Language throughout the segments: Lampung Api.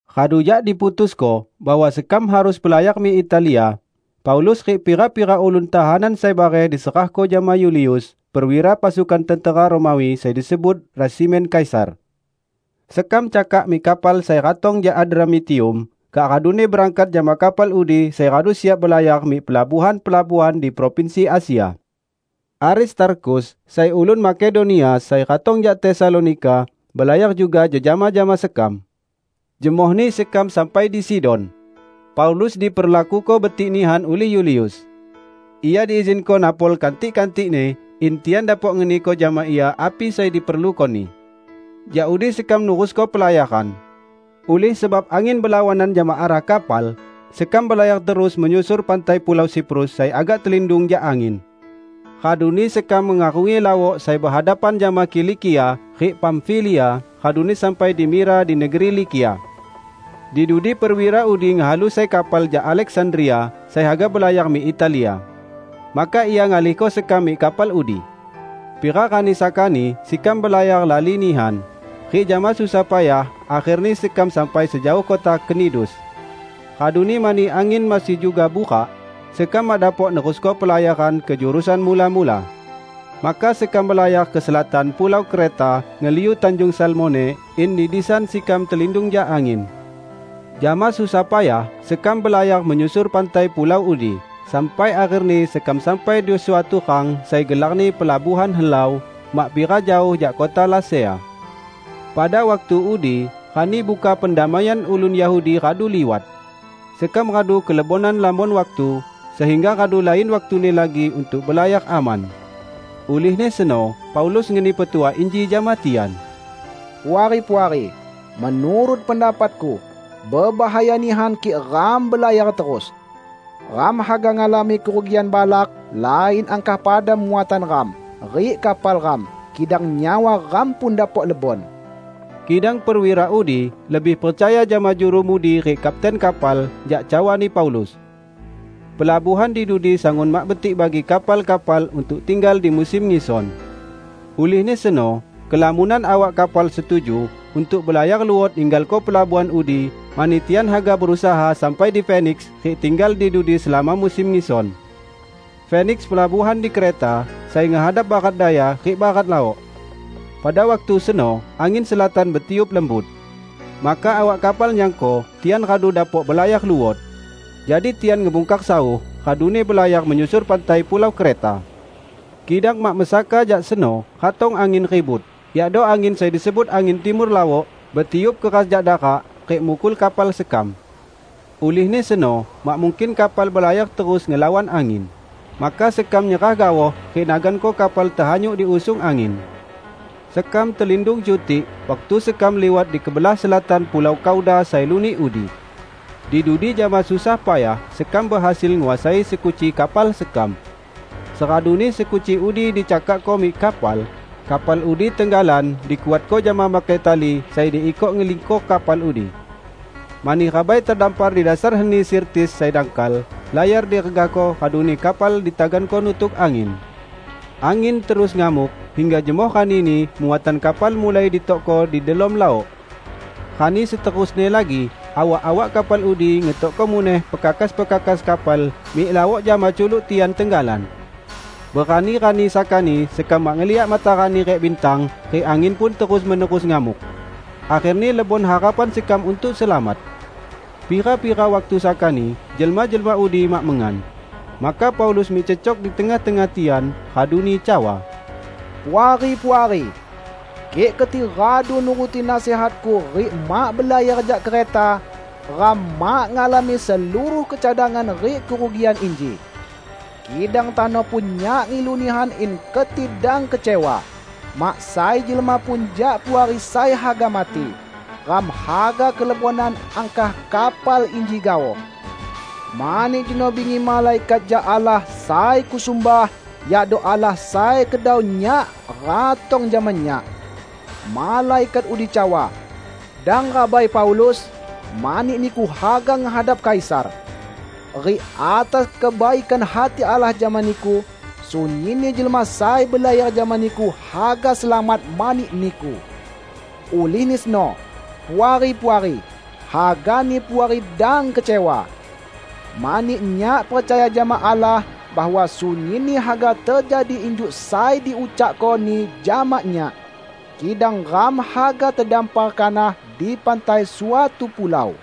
Radu jak diputusko bahwa sekam harus belayar mik Italia, Paulus rik pira-pira ulun tahanan sai bareh diserahko jama Yulius, perwira pasukan tentera Romawi sai disebut "Resimen Kaisar". Sekam cakak mik kapal sai ratong jak Adramitium, kak raduni berangkat jama kapal udi sai radu siap belayar mik pelabuhan-pelabuhan di provinsi Asia. Aristarkhus, sai ulun Makedonia sai ratong jak Tesalonika, belayar juga jejama jama sekam. Jemohni sekam sampai di Sidon. Paulus diperlakuko betik nihan ulih Yulius. Ia diizinko napol kantik-kantikni in tian dapok ngeniko jama ia api sai diperlukoni. Jak udi sekam nerusko pelayaran. Ulih sebab angin belawanan jama arah kapal, sekam belayar terus menyusur pantai pulau Siprus sai agak telindung jak angin. Raduni sekam mengarungi laok sai behadapan jama Kilikia rik Pamfilia raduni sampai di Mira di negeri Likia. Di dudi perwira udi ngehalu sai kapal jak Aleksandria sai haga belayar mik Italia. Maka ia ngalihko sekam mik kapal udi. Pira rani sakani sekam belayar lali nihan, rik jama susah payah akherni sekam sampai sejaoh kota Knidus. Raduni mani angin masih juga burak, sekam mak dapok nerusko pelayaran ke jurusan mula-mula. Maka sekam belayar ke selatan pulau Kreta ngeliu Tanjung Salmone in di disan sekam telindung jak angin. Jama susah payah sekam belayar menyusur pantai pulau udi sampai akherni sekam sampai di suatu rang sai gelarni Pelabuhan Helau, mak pira jaoh jak kota Lasea. Pada waktu udi Rani Buka Pendamaian ulun Yahudi radu liwat. Sekam radu kelebonan lamon waktu, sehingga radu lain waktuni lagi untuk belayar aman. Ulihni seno Paulus ngeni petuah inji jama tian, "Puari-puari, menurut pendapatku, bebahaya nihan kik ram belayar terus. Ram haga ngalami kerugian balak lain angkah pada muatan ram rik kapal ram, kidang nyawa ram pun dapok lebon." Kidang perwira udi lebih percaya jama juru mudi rik kapten kapal jak cawani Paulus. Pelabuhan di dudi sangun mak betik bagi kapal-kapal untuk tinggal di musim ngison. Ulihni seno kelamonan awak kapal setuju untuk belayar luot ninggalko pelabuhan udi mani tian haga berusaha sampai di Feniks rik tinggal di dudi selama musim ngison. Feniks pelabuhan di Kreta sai ngehadap barat daya rik barat laok. Pada waktu seno angin selatan betiup lembut. Maka awak kapal nyangko tian radu dapok belayar luot. Jadi tian ngebungkar sauh raduni belayar menyusur pantai pulau Kreta. Kidang mak mesaka jak seno ratong angin ribut -- yakdo angin sai disebut angin Timur Laok -- betiup keras jak darak, rik mukul kapal sekam. Ulihni seno mak mungkin kapal belayar terus ngelawan angin, maka sekam nyerah gaoh rik naganko kapal tehanyut diusung angin. Sekam telindung cutik, waktu sekam liwat di kebelah selatan pulau Kauda sai lunik udi. Di dudi jama susah payah sekam behasil nguasai sekuci kapal sekam. Seraduni sekuci udi dicakakko mik kapal, kapal udi tenggalan dikuatko jama makai tali sai diikok ngelingkor kapal udi. Mani rabai tedampar di dasar heni Sirtis sai dangkal, layar diregahko raduni kapal ditaganko nutuk angin. Angin terus ngamuk, hingga jemoh ranini muatan kapal mulai ditokko di delom laok. Rani seterusni lagi awak-awak kapal udi ngetokko muneh pekakas-pekakas kapal mik laok jama culuk tian tenggalan. Berani-rani sakani sekam mak ngeliak matarani rik bintang, rik angin pun terus-menerus ngamuk. Akherni lebon harapan sekam untuk selamat. Pira-pira waktu sakani jelma-jelma udi mak mengan. Maka Paulus mik cecok di tengah-tengah tian raduni cawa, "Puari-puari! Kik keti radu nuruti nasihatku rik mak belayar jak Kreta, ram mak ngalami seluruh kecadangan rik kerugian inji. Kidang tano pun nyak ngilu nihan in keti dang kecewa. Mak sai jelma pun jak Puari sai haga mati; ram haga kelebonan angkah kapal inji gaoh. Mani jeno bingi malaikat jak Allah sai kusumbah, yakdo Allah sai kedau nyak, ratong jama nyak. Malaikat udi cawa, 'Dang rabai, Paulus! Mani niku haga ngehadap Kaisar. Rik atas kebaikan hati Allah jama niku, sunyinni jelma sai belayar jama niku haga selamat mani niku.' Ulihni seno, Puari-puari, hagani Puari dang kecewa! Mani nyak percaya jama Allah bahwa sunyinni haga tejadi injuk sai diucakko-Ni jama nyak. Kidang ram haga tedampar kanah di pantai suatu pulau."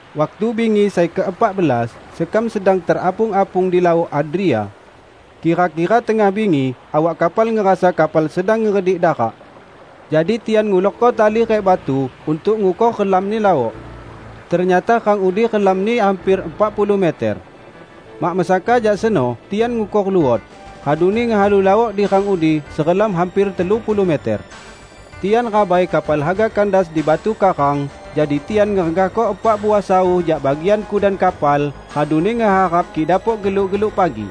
Waktu bingi sai keepak belas sekam sedang terapung-apung di Laok Adria. Kira-kira tengah bingi awak kapal ngerasa kapal sedang ngeredik darak. Jadi tian ngulorko tali rik batu untuk ngukor relamni laok. Ternyata rang udi relamni hamper epak puluh meter. Mak mesaka jak seno tian ngukor luot, raduni ngehalu laok di rang udi serelam hamper telu puluh meter. Tian rabai kapal haga kandas di batu karang, jadi tian ngeregahko epak uah sauh jak bagian kudan kapal, raduni ngeharap kik dapok geluk-geluk pagi.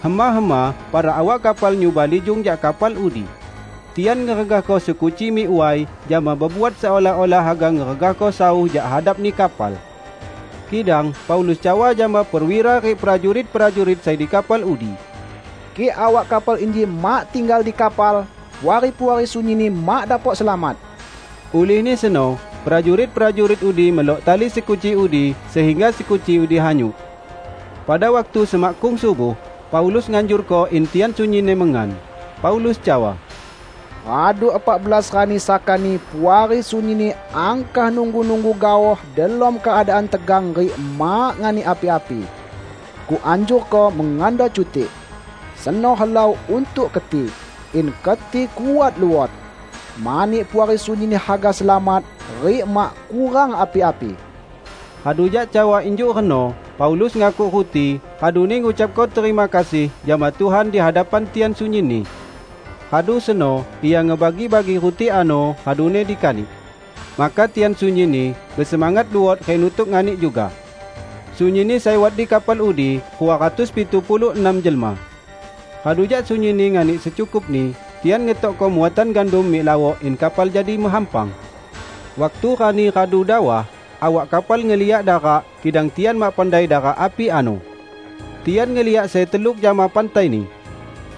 Hema-hema para awak kapal nyuba lijung jak kapal udi. Tian ngeregahko sekuci mik way, jama bebuat seolah-olah haga ngeregahko sauh jak hadapni kapal. Kidang Paulus cawa jama perwira rik prajurit-prajurit sai di kapal udi, "Kik awak kapal inji mak tinggal di kapal, Puari-puari sunyinni mak dapok selamat." Ulihni seno prajurit-prajurit udi melok tali sekuci udi, sehingga sekuci udi hanyut. Pada waktu semakkung subuh, Paulus nganjurko in tian sunyinni mengan. Paulus cawa, "Radu epak belas rani sakani Puari sunyinni angkah nunggu-nunggu gaoh delom keadaan tegang rik mak nganik api-api. Kuanjurko, mengando cutik. Seno helau untuk keti, in keti kuat luot. Mani Puari sunyinni haga selamat rik mak kurang api-api." Radu jak cawa injuk reno Paulus ngakuk ruti raduni ngucapko terima kasih jama Tuhan di hadapan tian sunyinni. Radu seno ia ngebagi-bagi ruti ano, raduni dikanik. Maka tian sunyinni besemangat luot rik nutuk nganik juga. Sunyinni sai wat di kapal udi rua ratus pitu puluh enam jelma. Radu jak sunyinni nganik secukupni, tian ngetokko muatan gandum mik laok in kapal jadi mehampang. Waktu rani radu dawah, awak kapal ngeliak darak, kidang tian mak pandai darak api ano. Tian ngeliak sai teluk jama pantaini.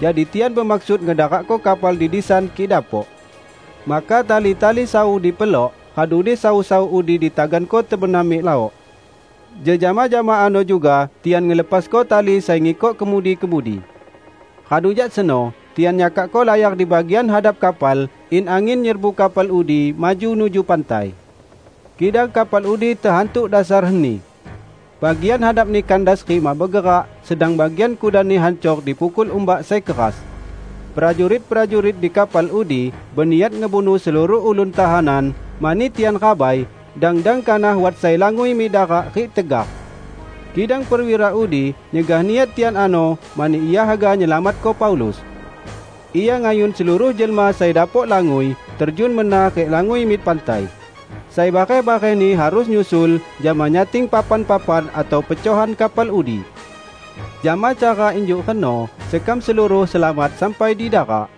Jadi tian bemaksud ngedarakko kapal di disan kik dapok. Maka tali-tali sauh dipelok raduni sauh-sauh udi ditaganko tebenam mik laok. Jejama jama ano juga tian ngelepasko tali sai ngikok kemudi-kemudi. Radu jak seno tian nyakakko layar di bagian hadap kapal in angin nyerbu kapal udi maju nuju pantai. Kidang kapal udi tehantuk dasar heni. Bagian hadapni kandas rik mak begerak, sedang bagian kudanni hancor dipukul umbak sai keras. Prajurit-prajurit di kapal udi beniat ngebunuh seluruh ulun tahanan, mani tian rabai dang-dang kanah wat sai langui mik darak rik tegar. Kidang perwira udi nyegah niat tian ano mani ia haga nyelamatko Paulus. Ia ngayun seluruh jelma sai dapok langui terjun mena rik langui mik pantai; sai bareh-barehni harus nyusul, jama nyating papan-papan atau pecohan kapal udi. Jama cara injuk reno sekam seluruh selamat sampai di darak.